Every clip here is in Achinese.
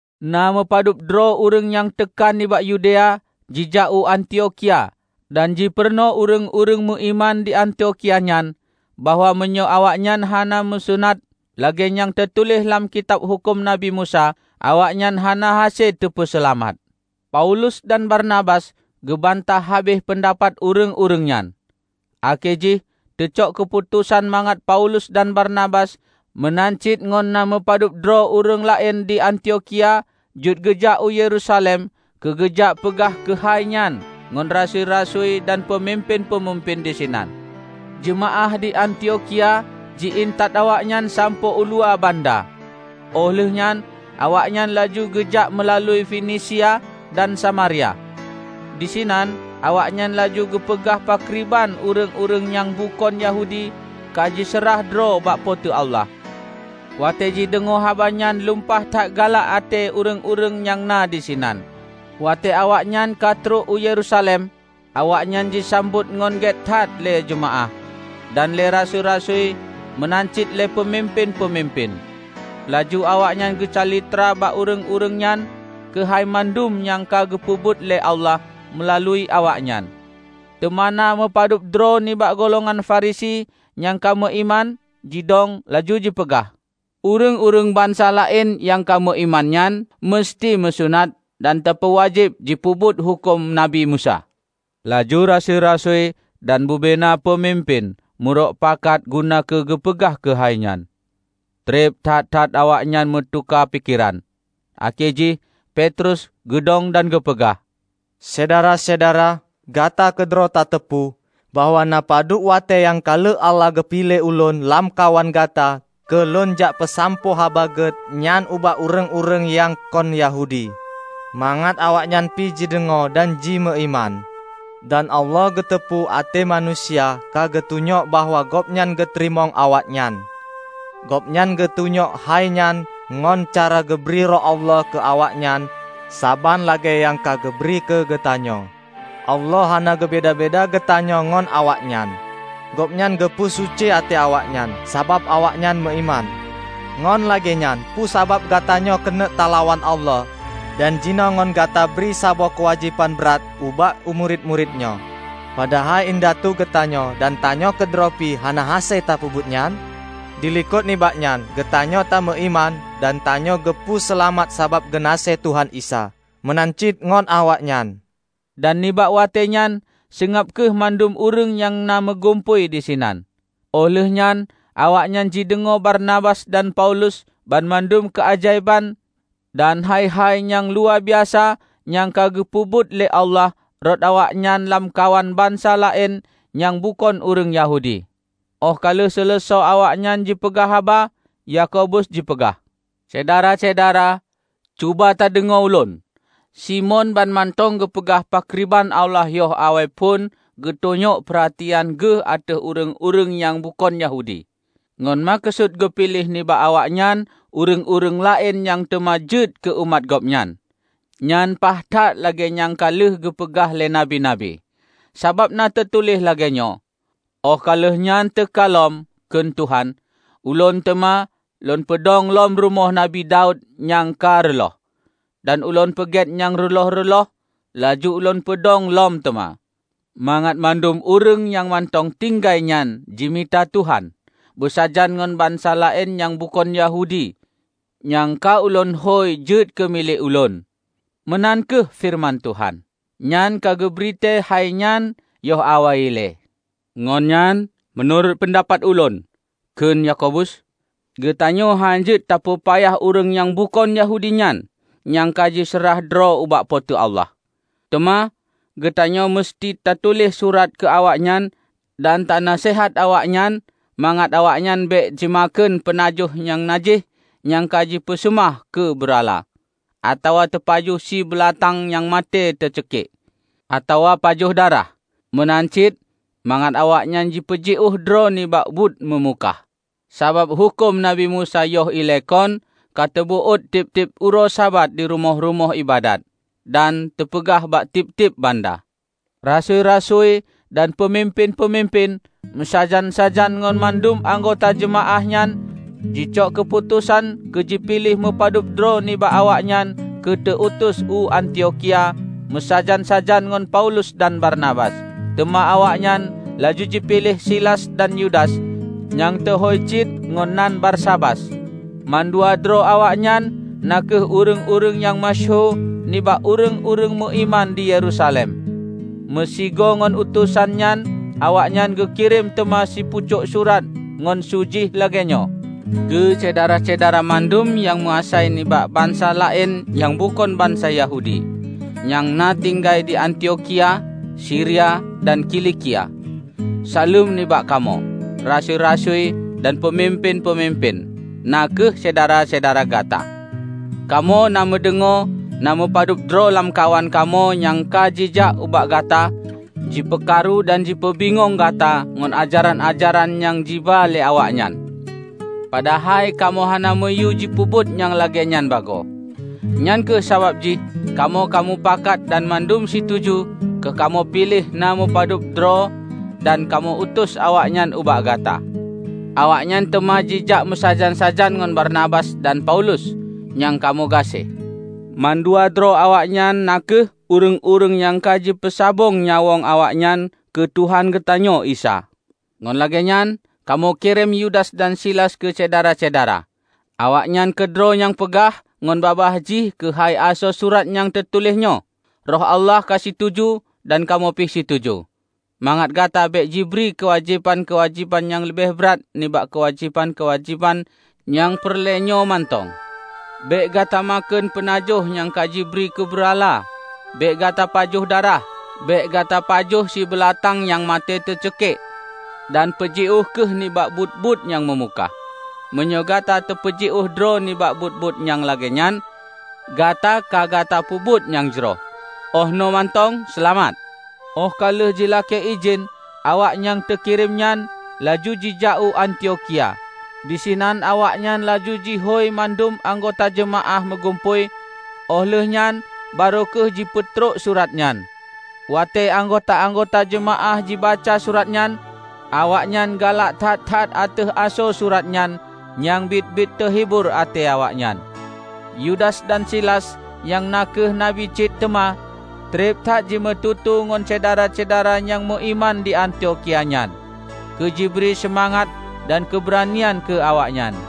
Na meupadub droe ureuëng nyang teuka nibak Yudea jijak u Antiokhia dan jipeurunoe ureuëng-ureuëng meuiman di Antiokhia nyan bahwa meunyoe awaknyan hana meusunat lagée nyang teutuléh lam kitab huköm Nabi Musa, awaknyan hana hase teupeuseulamat. Paulus dan Barnabas geubantah habéh peundapat ureuëng-ureuëng nyan. Akhé jih teucok keuputosan mangat Paulus dan Barnabas meunan cit ngon na meupadub droe ureuëng laén di Antiokhia jeuet geujak u Yerusalem keu geujak peugah keuhai nyan ngon rasui-rasui dan peumimpén-peumimpén disinan. Jeumaáh di Antiokhia ji intat awaknyan sampoe uluwa banda, óh lheueh nyan awaknyan laju geujak meulalu Finisia dan Samaria. Disinan awaknyan laju geupeugah pakriban ureuëng-ureuëng nyang bukon Yahudi ka jiseurah droe bak Po teu Allah. Watée jideungoe haba nyan lumpah that galak até ureuëng-ureuëng nyang na disinan. Watée awaknyan ka trok u Yerusalem, awaknyan jisambot ngon gét that lé jeumaáh, dan lé rasui-rasui meunan cit lé peumimpén-peumimpén. Laju awaknyan geucalitra bak ureuëng-ureuëng nyan keuhai mandum nyang ka geupeubuet lé Allah meulalu awaknyan. Teuma na meupadub droe nibak golongan Farisi nyang ka meuiman, jidong laju jipeugah, "Ureuëng-ureuëng bansa laén nyang ka meuiman nyan museuti meusunat dan teupeuwajéb jipeubuet huköm Nabi Musa." Laju rasui-rasui dan bubena peumimpén meurok pakat guna keu geupeugah keuhai nyan. Treb that-that awaknyan meutuka pikeran. Akhé jih Petrus geudong dan geupeugah, "Syedara-syedara! Gata keudroe tateupeue bahwa na meupadub watée nyang ka lheueh Allah ka geupiléh ulôn lamkawan gata keu lôn jak peusampoe Haba Gét nyan ubak ureuëng-ureuëng nyang kon Yahudi, mangat awaknyan pih jideungoe dan jimeuiman. Dan Allah geuteupeue até manusia ka geutunyok bahwa Gobnyan geuteurimong awaknyan; gobnyan geutunyok hai nyan ngon cara geubri Roh Allah keu awaknyan saban lagée nyang ka geubri keu geutanyoe. Allah hana geubeda-beda geutanyoe ngon awaknyan. Gobnyan geupeu suci até awaknyan, sabab awaknyan meuiman. Ngon lagée nyan, peue sabab gatanyoe keuneuk talawan Allah dan jinoe ngon gata bri saboh keuwajéban brat ubak murit-murit nyoe, padahai indatu geutanyoe dan tanyoe keudroe pih hana hase tapeubuet nyan? Dilikot nibak nyan, geutanyoe ta meuiman dan tanyoe geupeu seulamat sabab geunaséh Tuhan Isa; meunan cit ngon awaknyan." Dan nibak watée nyan seungab kheueh mandum ureuëng nyang meugumpôi disinan. Óh lheueh nyan awaknyan jideungoe Barnabas dan Paulus banmandum keuajaéban dan hai-hai nyang luwabiasa nyang ka geupeubuet lé Allah rot awaknyan lamkawan bansa laén nyang bukon ureuëng Yahudi. Óh ka lheueh seuleusoe awaknyan jipeugah haba, Yakobus jipeugah, "Syedara-syedara! Cuba tadeungoe ulôn. Simon banmantong geupeugah pakriban Allah yoh awai phon geutunyok peuratian Geuh ateueh ureuëng-ureuëng nyang bukon Yahudi, ngon meukeusut geupiléh nibak awaknyan ureuëng-ureuëng laén nyang teuma jeuet keu umat Gobnyan. Nyan paih that lagée nyang ka lheueh geupeugah lé Nabi-nabi. Sabab na teutuléh lagée nyoe, 'Óh ka lheueh nyan teuka lom,' kheun Tuhan, 'Ulôn teuma Lôn peudong lom rumoh Nabi Daud nyang ka reuloh, dan Ulôn peugét nyang reuloh-reuloh, laju Ulôn peudong lom teuma; mangat mandum ureuëng nyang mantong tinggai nyan jimita Tuhan, beusajan ngon bansa laén nyang bukon Yahudi nyang ka Ulôn hôi jeuet keu milék Ulôn.' Meunan kheueh feureuman Tuhan, nyang ka geubri tée hainyan yoh awai ilée." "Ngon nyan, meunurot peundapat ulôn," kheun Yakobus, "Geutanyoe hán jeuet tapeupayah ureuëng nyang bukon Yahudi nyan nyang ka jiseurah droe ubak Po teu Allah. Teuma geutanyoe museuti tatuléh surat keu awaknyan dan tanaseuhat awaknyan mangat awaknyan bék jimakheun peunajoh nyang najih nyang ka jipeuseumah keu beurala, atawa teupajoh sie beulatang nyang maté teuceukiek, atawa pajoh darah. Meunan cit mangat awaknyan jipeujiôh droe nibak buet meumukah. Sabab huköm Nabi Musa yoh ilée kon ka teubeuet tieb-tieb uroe Sabat di rumoh-rumoh iébadat, dan teupeugah bak tieb-tieb banda." Rasui-rasui dan peumimpén-peumimpén, meusajan-sajan ngon mandum anggota jeumaáh nyan jicok keuputosan keu jipiléh meu padub droe nibak awaknyan keu teu utus u Antiokhia meusajan-sajan ngon Paulus dan Barnabas. Teuma awaknyan laju jipiléh Silas dan Yudas nyang teuhôi cit ngon nan Barsabas. Mandua droe awaknyoe na kheueh ureuëng-ureuëng nyang meusyeuhu nibak ureuëng-ureuëng meuiman di Yerusalem. Meusigoe ngon utosan nyan awaknyan geukirém teuma sipucok surat nyang su jih lagée nyoe, "Keu syedara-syedara mandum nyang meuasai nibak bansa laén nyang bukon bansa Yahudi, nyang na tinggai di Antiokhia, Siria dan Kilikia. Saleuem nibak kamoe, rasui-rasui dan peumimpén-peumimpén, na kheueh syedara-syedara gata. Kamoe na meudeungoe na meupadub droe lamkawan kamoe nyang ka jijak ubak gata jipeukaru dan jipeubingong gata ngon ajaran-ajaran nyang jiba lé awaknyan. Padahai kamoe hana meuyue jipeubuet nyang lagée nyan bagoe. Nyang kheueh sabab jih kamoe ka mupakat dan mandum situju keu kamoe piléh na meupadub droe dan kamoe utus awaknyan ubak gata. Awaknyan teuma jijak meusajan-sajan ngon Barnabas dan Paulus nyang kamoe gaséh. Mandua droe awaknyoe na kheueh ureuëng-ureuëng nyang ka jipeusabong nyawöng awaknyan keu Tuhan geutanyoe Isa. Ngon lagée nyan, kamoe kirém Yudas dan Silas keu Syedara-syedara. Awaknyan keudroe nyang peugah ngon babah jih keuhai asoe surat nyang teutuléh nyoe. Roh Allah ka situju -- dan kamoe pih situju -- mangat gata bék jibri keuwajéban-keuwajéban nyang leubeh brat nibak keuwajéban-keuwajéban nyang peureulée nyoe mantong: bék gata makheun peunajoh nyang ka jibri keubeurala; bék gata pajoh darah, bék gata pajoh sie beulatang nyang maté teucikiek, dan peujiôh kheueh nibak buet-buet nyang meumukah. Meunyoe gata tapeujiôh droe nibak buet-buet nyang lagée nyan, gata ka gata peubuet nyang jroh. Óh noe mantong, seulamat!" Óh ka lheueh jilakée idhin, awak nyang teukirém nyan laju jijak u Antiokhia. Disinan awaknyan laju jihôi mandum anggota jeumaáh meugumpôi óh lheueh nyan barô kheueh jipeutrok surat nyan. Watée anggota-anggota jeumaáh jibaca surat nyan, awaknyan galak that-that ateueh asoe surat nyan nyang biet-biet teuhibor até awaknyan. Yudas dan Silas, nyang na kheueh nabi cit teuma, treb that jimeututoe ngon syedara-syedara nyang meuiman di Antiokhia nyan keu jibri seumangat dan keubeuranian keu awaknyan.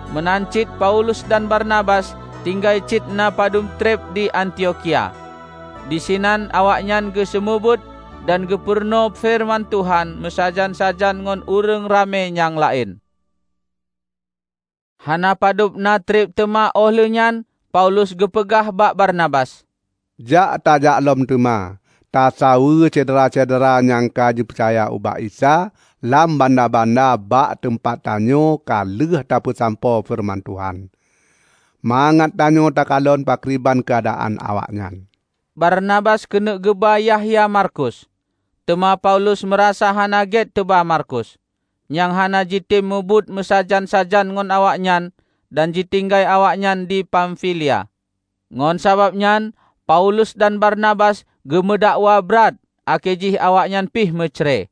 Meunan cit Paulus dan Barnabas tinggai cit na padub treb di Antiokhia. Disinan awaknyan geuseumeubeuet dan geupeurunoe feureuman Tuhan meusajan-sajan ngon ureuëng ramé nyang laén. Hana padub na treb teuma óh lheueh nyan Paulus geupeugah bak Barnabas, "Jak tajak lom teuma tasaweue syedara-syedara nyang ka jipeucaya ubak Isa lam banda-banda bak teumpat tanyoe ka lheueh tapeusampoe feureuman Tuhan; mangat tanyoe takalon pakriban keuadaan awaknyan." Barnabas keuneuk geuba Yahya Markus, teuma Paulus meurasa hana gét teuba Markus, nyang hana jitem mubuet meusajan-sajan ngon awaknyan dan jitinggai awaknyan di Pamfilia. Ngon sabab nyan Paulus dan Barnabas geumeudakwa brat akhé jih awaknyan pih meucre: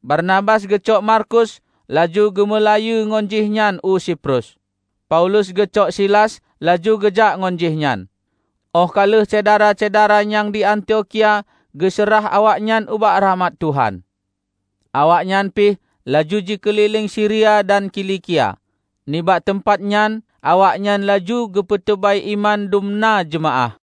Barnabas geucok Markus laju geumeulayeue ngon jih nyan u Siprus. Paulus geucok Silas laju geujak ngon jihnyan óh ka lheueh syedara-syedara nyang di Antiokhia geuseurah awaknyan ubak rakhmat Tuhan. Awaknyan pih laju jikeulileng Siria dan Kilikia; nibak teumpat nyan awaknyan laju geupeuteubai iman dumna jeumaáh.